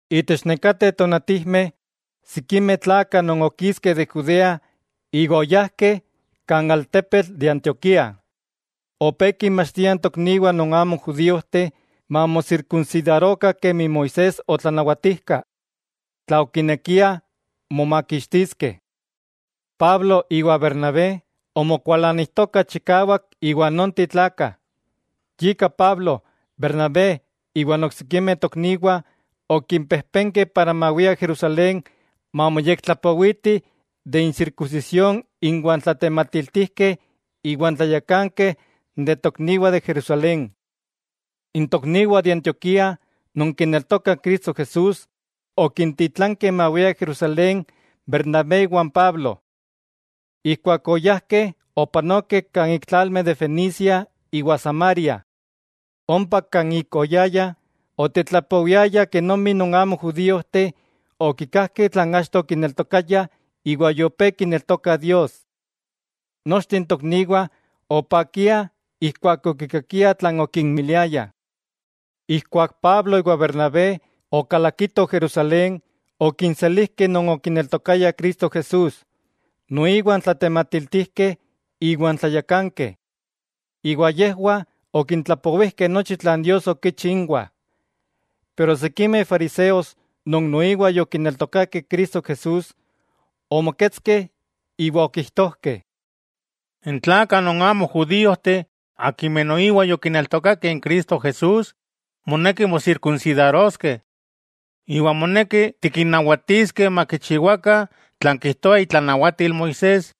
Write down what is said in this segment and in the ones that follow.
Itech nekateh tonatijmeh, sikimeh tlakah non okiskeh de Judea iwa oyajkeh kan altepetl de Antioquía, opé kinmachtiah n tokniwah non amo judíojteh mamosirkunsidarokah kemi Moisés otlanawatijka, tla okinekiah momakixtiskeh. Pablo iwa Bernabé omokualanijtokah chikawak iwa nonteh tlakah. Yika Pablo, Bernabé iwan oksikimeh tokniwah, okimpejpenkeh mawiah Jerusalén mamoyektlapowitih de n sirkunsisión inwah n tlatematiltijkeh iwa n tlayakankeh de n tokniwah de Jerusalén. N tokniwah de Antioquía, non kineltokah Cristo Jesús, okintitlankeh mawiah Jerusalén Bernabé iwan Pablo. Ijkuak oyajkeh opanokeh kan ik tlalmeh de Fenicia iwa Samaria. Ompa kan ik oyayah, otetlapowiayah kenomi non amo judíojteh okikajkeh tlan achto okineltokayah iwa yopé kineltokah Dios. Nochteh n tokniwah opakiah ijkuak okikakiah tlan okinmiliayah. Ijkuak Pablo iwa Bernabé okalakitoh Jerusalén, okinselijkeh non okineltokayah Cristo Jesús, noiwa n tlatematiltijkeh iwa n tlayakankeh. Iwa yejwah okintlapowijkeh nochi tlan Dios okichi inwah. Pero sikimeh fariseos non noiwa yokineltokakeh Cristo Jesús, omoketskeh iwa okijtojkeh: —N tlakah non amo judíojteh akimeh noiwa yokineltokakeh Cristo Jesús, moneki mosirkunsidaroskeh. Iwa moneki tikinnawatiskeh makichiwakah tlan kijtoa itlanawatil Moisés.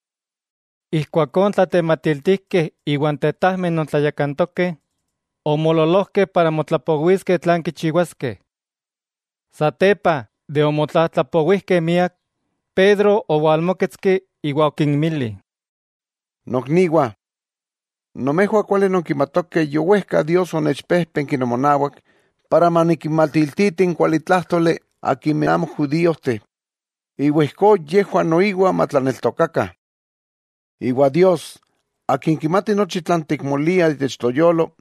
Ijkuakó n tlatematiltijkeh iwa n tetajmeh non tlayakantokeh, omoololojkeh para motlapowiskeh tlan kichiwaskeh. Ijkuak yomotlapowijkeh, Pedro owalmóketski iwa okinmili: —Nokniwah, nomejwah kuali nonkimatokeh yowejka Dios onechpéjpenki nomonawak, para manikinmatiltiti n kualitlájtoli akimeh amo judíojteh, iwa ijkó yejwah noiwa matlaneltokakah. Iwa Dios, Akin kimati nochi tlan tikmoliah itech toyolo,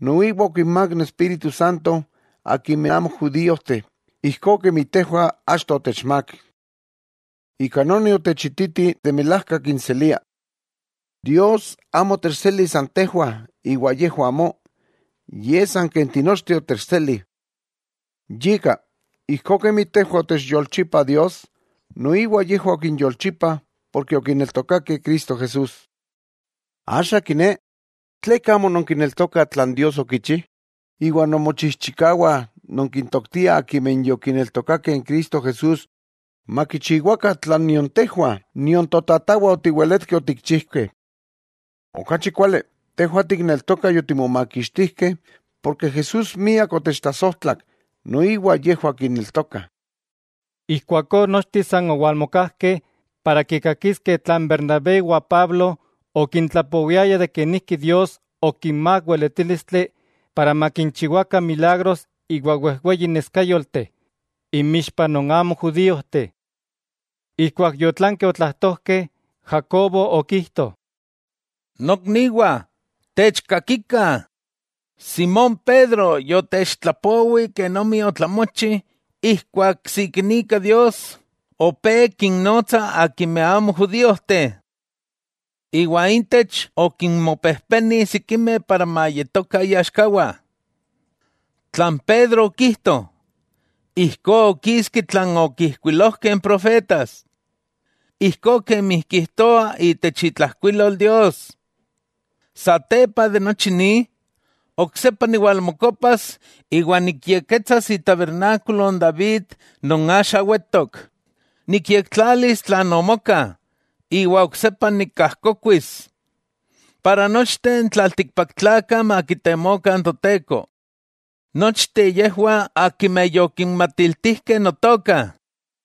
noiwa okinmák n Espíritu Santo akimeh amo judíojteh ijkó kemi tejwah achto otechmák. Ika noni otechititi de milajka kinselia. Dios amo otechseli san tejwah iwa yejwah amó, yej san ken tinochteh otechseli. Yika, ijkó kemi tejwah otechyolchipa Dios, noiwa yejwah okinyolchipa porke okineltokakeh Cristo Jesús. Axa, ¿tleka amo nonkineltokah tlan Dios okichi? Iwa nonmochijchikawah nonkintoktiah akimeh yokineltokakeh n Cristo Jesús makichiwakah tlan nion tejwah, ¡nion totatawah otiweletkeh otikchijkeh! Okachi kuali, tejwah tikneltokah yotimomakixtijkeh porke Jesús miak otechtlasojtlak, noiwa yejwah kineltokah. Ijkuakó nochteh san owalmokajkeh para kikakiskeh tlan Bernabé iwa Pablo okintlapowiayah kenijki Dios okinmák weletílistli para makinchiwakah milagros iwa wejweyi neskáyolteh inmixpah non amo judíojteh. Ijkuak yotlankeh otlajtojkeh, Jacobo okijto: —Nokniwah, techkakikah: Simón Pedro yotechtlapowi kenomi otlamochi ijkuak sikinika Dios opé kinnotsa akimeh amo judíojteh. Iwa intech okinmopejpeni sikimeh para mayetokah iaxkawah. Tlan Pedro okijto, ijkó okiski tlan okijkuilojkeh n profetas, ijkó kemi kijtoa itech itlajkuilol Dios: Satepa de nochi ni, oksepa niwalmokopas iwa nikyekketsas itabernákulo n David non axa wetok; nikyektlalis tlan omoka, iwa oksepa nikajkokuis, para nochteh n tlaltikpaktlakah makitemokah n Toteko: Nochteh yejwah akimeh yokinmatiltijkeh Notoka.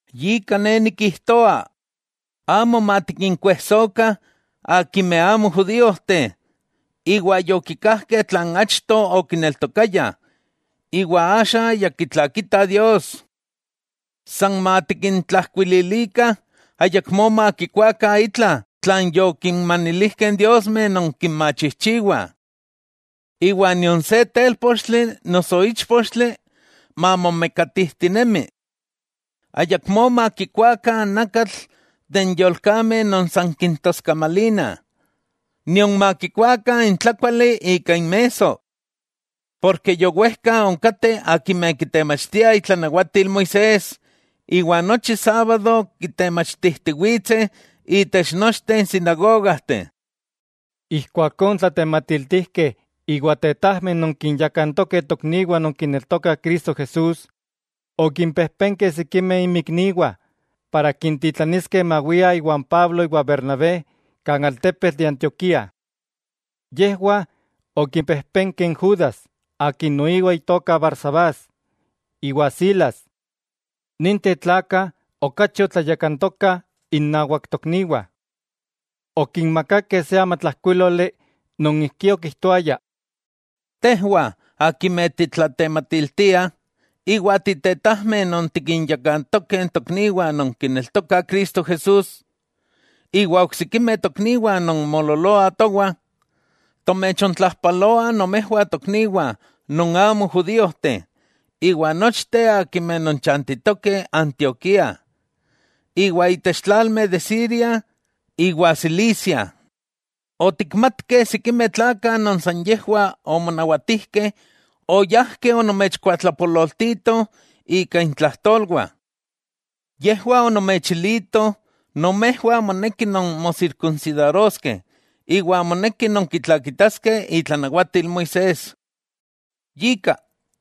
'Yika ne nikijtoa, amo matikinkuejsokah akimeh amo judíojteh iwa yokikajkeh tlan achto okineltokayah iwa axa ya kitlakitah Dios. San matikintlajkuililikah ayakmó makikuakah itla tlan yokinmanilijkeh n diosmeh non kinmachijchiwah. Iwa nion se télpochtli noso íchpochtli mamomekatijtinemi. Ayakmó makikuakah nakatl de n yolkameh non san kintoskamalina, nion makikuakah n tlakuali ika inmesso. Porke yowejka onkateh akimeh kitemachtiah itlanawatil Moisés, iwa nochi sábado kitemachtijtiwitseh itech nochteh sinagogajteh. Ijkuakó n tlatematiltijkeh iwa n tetajmeh non kinyakantokeh tokniwah non kineltokah Cristo Jesús, okimpejpenkeh sikimeh inmikniwah para kintitlaniskeh mawiah iwan Pablo iwa Bernabé kan altepetl de Antioquía. Yejwah okipejpenkeh n Judas, akin noiwa itoka Barsabás, iwa Silas; ninteh tlakah okachi otlayakantokah innawak tokniwah. Okinmakakeh se amatlajkuíloli non ijkí okijtoaya: “Tejwah akimeh titlatematiltiah, iwa titetajmeh non tikinyakantokeh tokniwah non kineltokah Cristo Jesús, iwa oksikimeh tokniwah non moololoah towah: Tomechontlajpaloah nomejwah tokniwah non amo judíojteh iwa nochteh akimeh nonchantitokeh Antioquía iwa itech tlalmeh de Siria iwa Cilicia. Otikmatkeh sikimeh tlakah non san yejwah omonawatijkeh oyajkeh onomechkuatlapololtitoh ika intlajtolwah. Yejwah onomechilitoh nomejwah monekih nonmosirkunsidaroskeh iwa monekih nonkitlakitaskeh itlanawatil Moisés. Yika,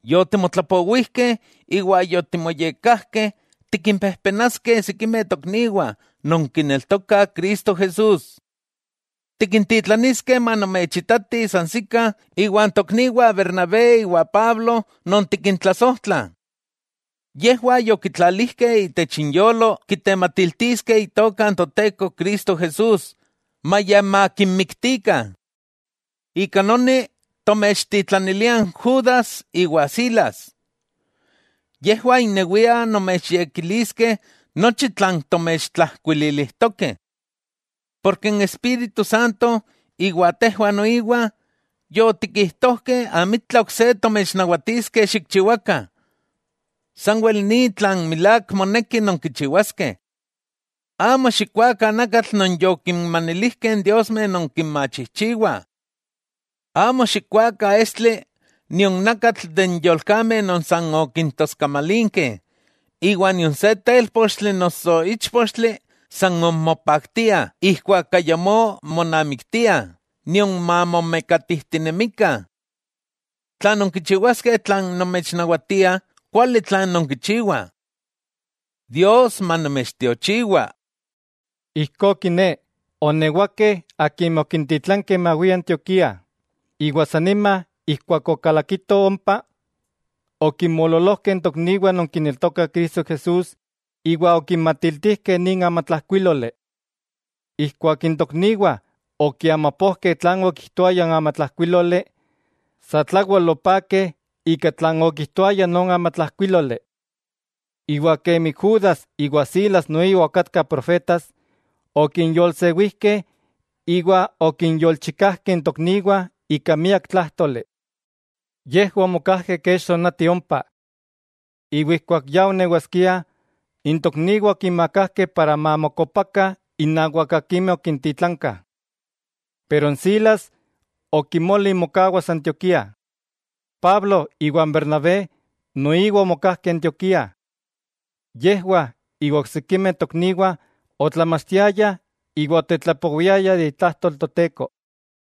yotimotlapowijkeh iwa yotimoyekkajkeh tikimpejpenaskeh sikimeh tokniwah non kineltokah Cristo Jesús. Tikintitlaniskeh manomechitatih sansikah iwa n tokniwah Bernabé iwa Pablo non tikintlasojtlah. Yejwah yokitlalijkeh itech inyolo kitematiltiskeh Itoka n Toteko Cristo Jesús maya makinmiktikah. Ika noni tomechtitlaniliah n Judas iwa Silas. Yejwah innewiah nomechyekiliskeh nochi tlan tomechtlajkuililijtokeh. Porke n Espíritu Santo iwa tejwah noiwa, yotikijtojkeh amitla ok se tomechnawatiskeh xikchiwakah; sanwel ni tlan milák moneki nonkichiwaskeh: Amo xikkuakah nakatl non yokinmanilijkeh n diosmeh non kinmachijchiwah. Amo xikkuakah estli nion nakatl de n yolkameh non san okintoskamalinkeh, iwa nion se télpochtli noso íchpochtli mamomekatikah ijkuak ayamó monamiktiah nion mamomekatijtinemikah. Tla nonkichiwaskeh tlan tomechnawatiah, kuali tlan nonkichiwah. Dios manomechtiochiwa.” Ijkó kiné, oonewakeh akimeh okintitlankeh mawiah Antioquía, iwa san nima ijkuak okalakitoh ompa, okinmoololojkeh n tokniwah non kineltokah Cristo Jesús iwa okinmaktilijkeh nin amatlajkuíloli. Ijkuak n tokniwah okiamapojkeh tlan okijtoaya n amatlajkuíloli, satlawel opakeh ika tlan okijtoaya non amatlajkuíloli. Iwa kemi Judas iwa Silas noiwa okatkah profetas, okinyolsewijkeh iwa okinyolchikajkeh n tokniwah ika miak tlájtoli. Yejwah omokajkeh kech tonati ompa. Iwa ijkuak ya onewaskiah, n tokniwah okinmakajkeh para mamokopakah innawak akimeh okintitlankah. Pero n Silas okimoli mokawas Antioquía. Pablo iwa n Bernabé noiwa omokajkeh Antioquía. Yejwah iwa oksikimeh tokniwah otlamachtiayah iwa otetlapowiayah de itlajtol Toteko.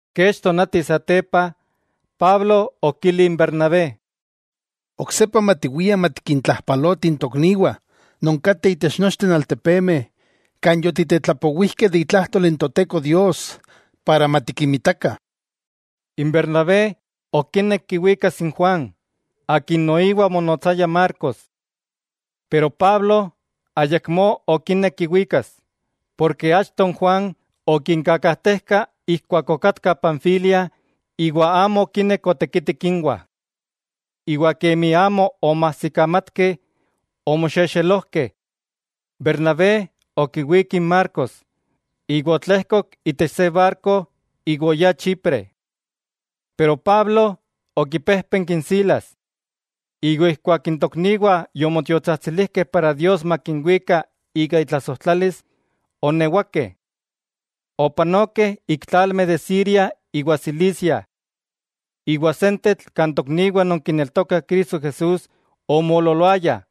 Kech tonati satepa, Pablo okili n Bernabé: —Oksepa matiwiah matikintlajpalotih n tokniwah non kateh itech nochteh n altepemeh kan yotitetlapowijkeh de itlajtol n Toteko Dios para matikinmitakah. N Bernabé okinek kiwikas n Juan, akin noiwa omonotsaya Marcos, pero Pablo ayakmó okinek kiwikas, porke achto n Juan okinkakajtejka ijkuak okatkah Panfilia iwa amo okinek otekitik inwah. Iwa kemi amo omoajsikamatkeh, omoxexelojkeh. Bernabé okiwík n Marcos, iwa otlejkok itech se barko iwa oyá Chipre, pero Pablo okipéjpenki n Silas. Iwa keman n tokniwah yomotiotsajtsilijkeh para Dios makinwika ika itlasojtlalis, oonewakeh. Opanokeh ik tlalmeh de Siria iwa Cilicia. Iwa sentetl kan tokniwah non kineltokah Cristo Jesús omoololoayah,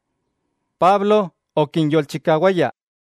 Pablo okinyolchikawaya.